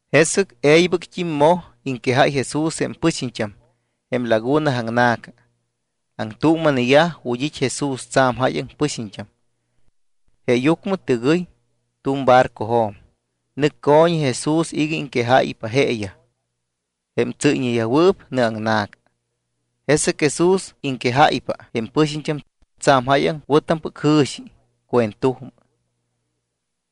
Jesɨc e̱ybɨct́im moj iŋquejáy Jesús jém pɨxiñt́am jém laguna aŋna̱ca. Aŋtuuma̱neyaj ju̱t́ it́ Jesús tsa̱m jáyaŋ pɨxiñt́am. Jeeyucmɨ tɨgɨy tu̱m barcojo̱m, nɨc co̱ñi Jesús iga iŋquejáypa jeeyaj jém tsɨ́yñeyajwɨɨp nɨaŋna̱ca. Jesɨc Jesús iŋquejáypa jém pɨxiñt́am tsa̱m jáyaŋ wɨ̱tampɨc jɨ̱xi cuentujmɨ.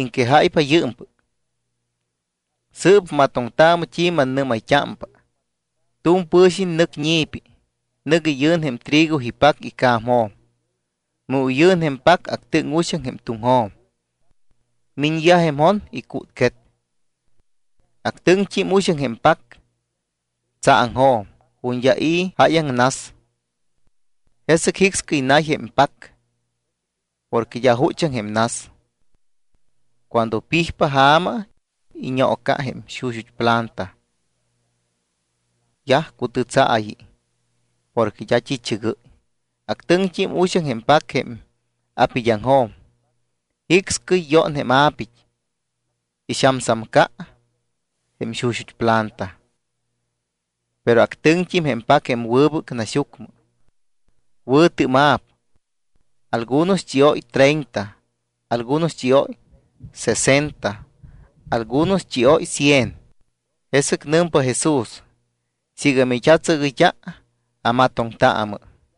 Iŋquejáypa yɨɨmpɨc: —Sɨɨp matoŋtaamɨ t́i mannɨ́mayt́ámpa. Tu̱m pɨ̱xiñ nɨc ñi̱pi, nɨc iyɨ̱n jém trigo ipac ica̱mjo̱m. Mu iyɨ̱n jém pac, actɨŋ uxaŋ jém tuŋjo̱m. Miñyaj jém jon, icútquet. Actɨŋt́im uxaŋ jém pac tsaaŋjo̱m ju̱t́ d́a i̱ jáyaŋ nas. Jesɨc jicscɨy nay jém pac porque d́a juchaŋ jém nas. Cuando pijpa ja̱ma, iñoonoca jém xuxut́ planta. Yaj cutɨtsaayi porque d́a t́i̱chɨgɨ́y. Actɨŋt́im uxaŋ jém pac jém a̱pid́aŋjo̱m. Jicscɨy yón jém a̱pit́, ixamsamca jém xuxut́ planta. Pero actɨŋt́im jém pac jém wɨbɨc naxyucmɨ. Wɨ̱tɨ́ma̱p. Algunos chióy treinta, algunos chióy sesenta, algunos chióy cien. Jesɨc nɨmpa Jesús: —Siiga mit́atsɨgɨyt́a amatoŋtaamɨ.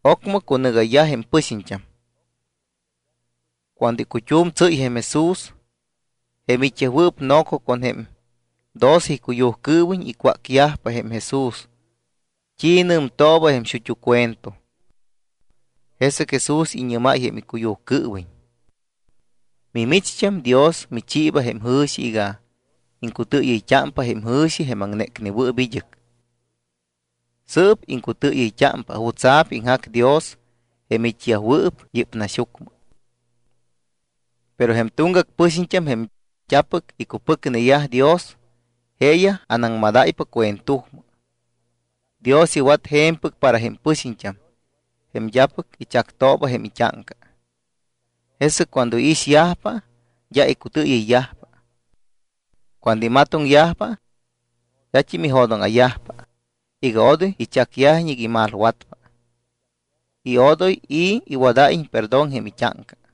Ocmɨ cunɨgayyaj jém pɨxiñt́am. Cuando icut́um tsɨ́y jém Jesús, jém it́yajwɨɨp noco con jém doce icuyujcɨɨwiñ icwácyajpa jém Jesús t́i nɨmtooba jém xut́u cuento. Jesɨc Jesús iñɨ́máy jém icuyujcɨɨwiñ: —Mimicht́am, Dios michiiba jém jɨ̱xi iga iŋcutɨɨyɨyt́ámpa jém jɨ̱xi jém aŋnécnewɨɨp id́ɨc. Sɨɨp iŋcutɨɨyɨyt́ámpa jutsa̱p iŋjac Dios jém it́yajwɨɨp yɨ́p naxyucmɨ. Pero jém tuŋgac pɨxiñt́am, jém d́apɨc icupɨcneyaj Dios, jeeyaj anaŋmadáypa cuentujmɨ. Dios iwat je̱mpɨc para jém pɨxiñt́am jém d́apɨc ichactooba jém it́áŋca, jesɨc cuando iixyajpa, d́a icutɨɨyɨyyajpa. Cuando imatoŋyajpa, d́at́im ijo̱dóŋa̱yajpa iga odoy ichacyajiñ iga imalwatpa y odoy i̱ iwadáyiñ perdón jém it́áŋca.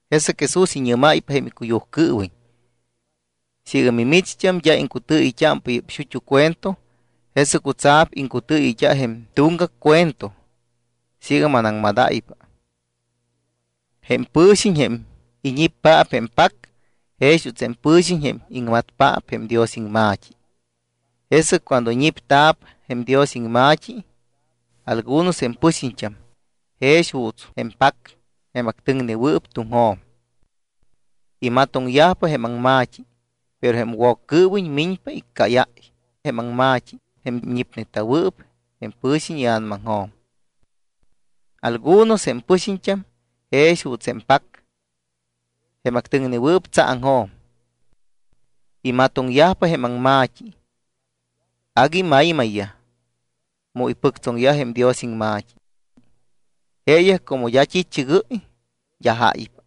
Jesɨc Jesús iñɨ́máypa jém icuyujcɨɨwiñ: —Siiga mimicht́am d́a iŋcutɨɨyɨyt́ámpa yɨ́p xut́u cuento, ¿jesɨc jutsa̱p iŋcutɨɨyɨyt́a jém tuŋgac cuento siiga manaŋmadáypa? Jém pɨ̱xiñ jém iñippaap jém pac jex juuts jém pɨ̱xiñ jém iŋmatpaap jém Dios iŋma̱t́i. Jesɨc cuando ñipta̱p jém Dios iŋma̱t́i algunos jém pɨxiñt́am jex juuts jém pac jém actɨŋnewɨɨp tuŋjo̱m. Imatoŋyajpa jém aŋma̱t́i, pero jém Woccɨɨwiñ miñpa iccáyáy jém aŋma̱t́i jém ñipneta̱wɨɨp jém pɨ̱xiñ ia̱namaŋjo̱m. Algunos jém pɨxiñt́am jex juuts jém pac jém actɨŋwɨɨp tsaaŋjo̱m. Imatoŋyajpa jém aŋma̱t́i. Agui maymayyaj mu ipɨctsoŋyaj jém Dios iŋma̱t́i. Jeeyaj como d́a t́i̱chɨgɨ́y, d́a jáypa.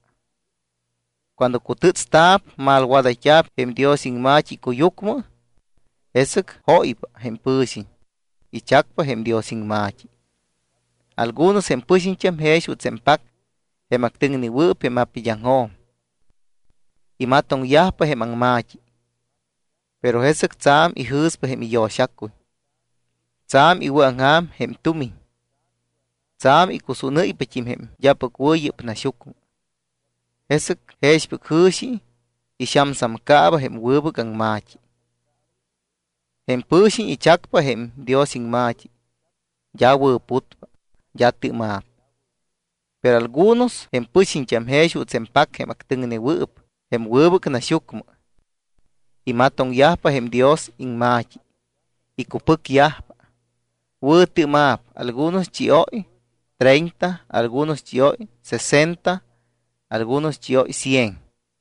Cuando cutɨ́tsta̱p, malwadayt́a̱p jém Dios iŋma̱t́i icuyucmɨ, jesɨc jóypa jém pɨ̱xiñ, ichacpa jém Dios iŋma̱t́i. Algunos jém pɨxiñt́am jex juuts jém pac jém actɨŋnewɨɨp jém apid́aŋjo̱m. Imatoŋyajpa jém aŋma̱t́i. Pero jesɨc tsa̱m ijɨ̱spa jém iyo̱xacuy, tsa̱m iwɨ̱aŋja̱m jém tumiñ, tsa̱m icusúnɨ́ypat́im jém d́apɨc wɨ̱ yɨ́p naxyucmɨ. Jesɨc jexpɨc jɨ̱xi ixamsamcaaba jém wɨbɨc aŋma̱t́i. Jém pɨ̱xiñ ichacpa jém Dios iŋma̱t́i, d́a wɨ̱putpa, d́a tɨ́ma̱p. Pero algunos jém pɨxiñt́am jex juuts jém pac jém actɨŋnewɨɨp jém wɨbɨc naxyucmɨ. Imatoŋyajpa jém Dios iŋma̱t́i, icupɨcyajpa, wɨ̱tɨ́ma̱p. Algunos chióy treinta, algunos chióy sesenta, algunos chióy cien.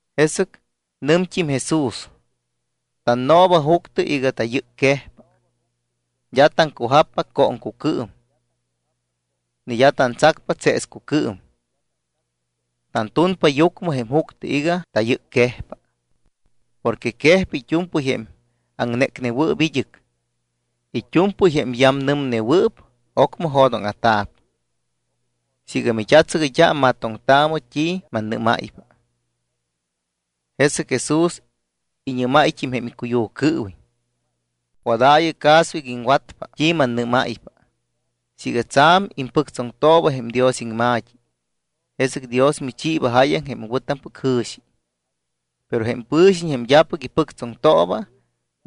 Jesɨc nɨmt́im Jesús: —Tannooba juctɨ iga tayɨcquejpa. D́a taŋcujappa cooŋcucɨɨm ni d́a tantsacpa tseescucɨɨm. Tantunpa yucmɨ jém juctɨ iga tayɨcquejpa. Porque quejpa it́u̱mpɨy jém aŋnécnewɨɨp id́ɨc. It́u̱mpɨy jém yamnɨmnewɨɨp, ocmɨ jo̱dóŋa̱ta̱p. Siiga mit́atsɨgɨyt́a, matoŋtaamɨ t́i mannɨ́máypa. Jesɨc Jesús iñɨ́máyt́im jém icuyujcɨɨwiñ: —Wadaayɨ caso iga iŋwatpa t́i mannɨ́máypa. Siiga tsa̱m impɨctsoŋtooba jém Dios iŋma̱t́i, jesɨc Dios michiiba jáyaŋ jém wɨ̱tampɨc jɨ̱xi. Pero jém pɨ̱xiñ jém d́apɨc ipɨctsoŋtooba,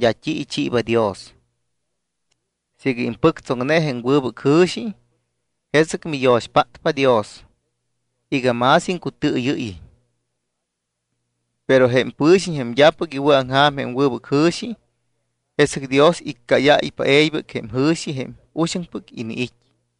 d́a t́i ichiiba Dios. Siiga impɨctsoŋne jém wɨbɨc jɨ̱xi, jesɨc miyo̱xpátpa Dios iga más iŋcutɨɨyɨ́yiñ. Pero jém pɨ̱xiñ jém d́apɨc iwɨ̱aŋja̱m jém wɨbɨc jɨ̱xi, jesɨc Dios iccáyáypa e̱ybɨc jém ijɨ̱xi jém uxaŋpɨc iniit́.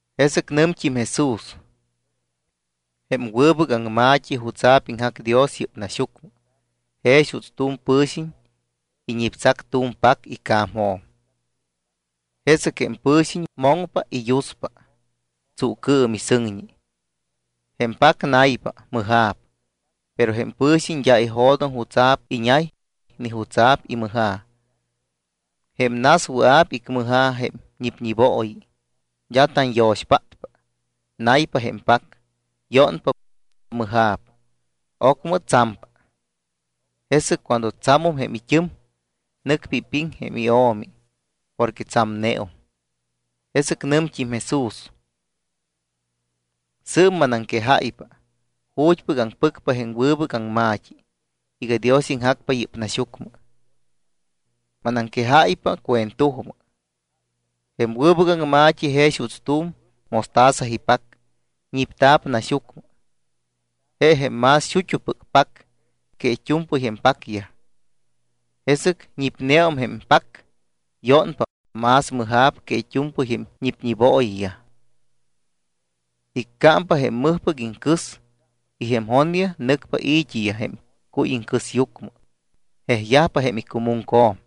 Jesɨc nɨmt́im Jesús: —Jém wɨbɨc aŋma̱t́i jutsa̱p iŋjac Dios yɨ́p naxyucmɨ jex juuts tu̱m pɨ̱xiñ iñiptsac tu̱m pac ica̱mjo̱m. Jesɨc jém pɨ̱xiñ moŋpa y yuspa, tsuucɨɨm y sɨŋñi. Jém pac naypa, mɨja̱p. Pero jém pɨ̱xiñ d́a ijo̱doŋ jutsa̱p iñay ni jutsa̱p imɨja̱. Jém nas wɨa̱p icmɨja̱ jém ñipñibooyi, d́a tanyo̱xpátpa. Naypa jém pac, yónpa, mɨja̱p, ocmɨ tsampa. Jesɨc cuando tsamum jém it́ɨm, nɨcpa ipiŋ jém io̱mi porque tsamneum. Jesɨc nɨmt́im Jesús: —Sɨɨp manaŋquejáypa ju̱t́pɨc aŋpɨcpa jém wɨbɨc aŋma̱t́i iga Dios iŋjacpa yɨ́p naxyucmɨ. Manaŋquejáypa cuentujmɨ. Jém wɨbɨc aŋma̱t́i jex juuts tu̱m mostaza ipac ñipta̱p naxyucmɨ. Je jém más xut́upɨc pac que it́u̱mpɨy jém pacyaj. Jesɨc ñipneum jém pac, yónpa, más mɨja̱p que it́u̱mpɨy jém ñipñibooyiyaj. Iccámpa jém mɨjpɨc iŋcɨs y jém jonyaj nɨcpa i̱t́iyaj jém cuy iŋcɨsyucmɨ, jejyajpa jém icumuŋco̱m.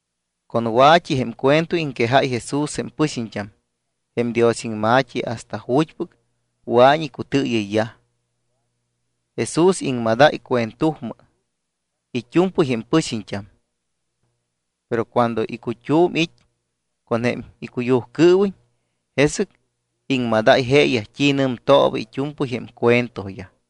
Con wa̱t́i jém cuento iŋquejáy Jesús jém pɨxiñt́am jém Dios iŋma̱t́i hasta ju̱t́pɨc wɨa̱iñ icutɨɨyɨyyaj. Jesús iŋmadáy cuentujmɨ it́u̱mpɨy jém pɨxiñt́am. Pero cuando icut́um it́ con jém icuyujcɨɨwiñ, jesɨc iŋmadáy jeeyaj t́i nɨmtooba it́u̱mpɨy jém cuentoyaj.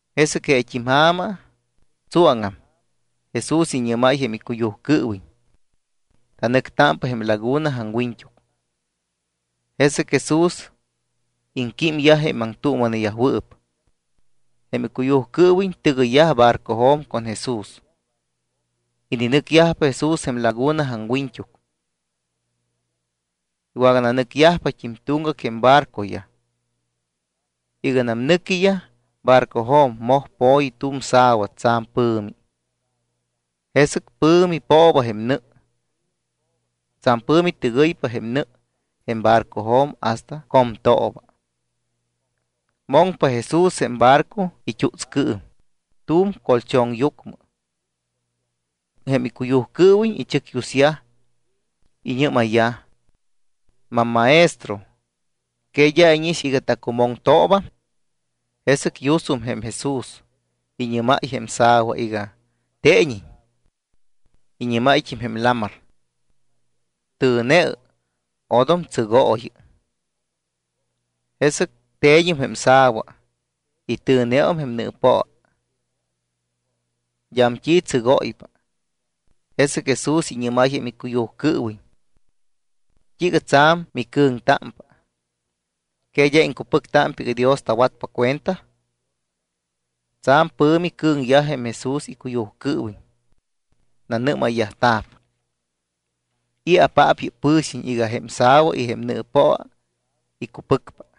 Jesɨc jeet́im ja̱ma, tsuáŋam, Jesús iñɨ́máy jém icuyujcɨɨwiñ: —Tanɨctámpa jém laguna aŋwiñt́uc. Jesɨc Jesús iŋquímyaj jém aŋtuuma̱neyajwɨɨp. Jém icuyujcɨɨwiñ tɨgɨyyaj barcojo̱m con Jesús. Ininɨcyajpa Jesús jém laguna aŋwiñt́uc. Iwagananɨcyajpat́im tuŋgac jém barcoyaj. Iganam nɨquiyaj barcojo̱m, moj po̱yi tu̱m sa̱wa tsa̱m pɨ̱mi. Jesɨc pɨ̱mi pooba jém nɨ, tsa̱m pɨ̱mi tɨgɨypa nɨ jém barcojo̱m hasta comtooba. Moŋpa Jesús jém barco it́utscɨɨm tu̱m colchonyucmɨ. Jém icuyujcɨɨwiñ ichɨcyusyaj, iñɨ́mayyaj: —Mammaestro, ¿que d́a íñix iga tacumoŋtoobam? Jesɨc yusum jém Jesús, iñɨ́máy jém sa̱wa iga teeñiñ. Iñɨ́máyt́im jém lamar: —¡Tɨ̱neɨ, odom tsɨgooyɨ! Jesɨc te̱ñum jém sa̱wa y tɨ̱neum jém nɨɨpoa. D́am t́i tsɨgóypa. Jesɨc Jesús iñɨ́máy jém icuyujcɨɨwiñ: —¿T́iiga tsa̱m micɨ̱ŋtámpa? ¿Que d́a iŋcupɨctámpa iga Dios tawatpa cuenta? Tsa̱m pɨ̱mi cɨ̱ŋyaj jém Jesús icuyujcɨɨwiñ. Nanɨ́mayyajta̱p: —¿I̱apaap yɨ́p pɨ̱xiñ iga jém sa̱wa y jém nɨɨpoa icupɨcpa?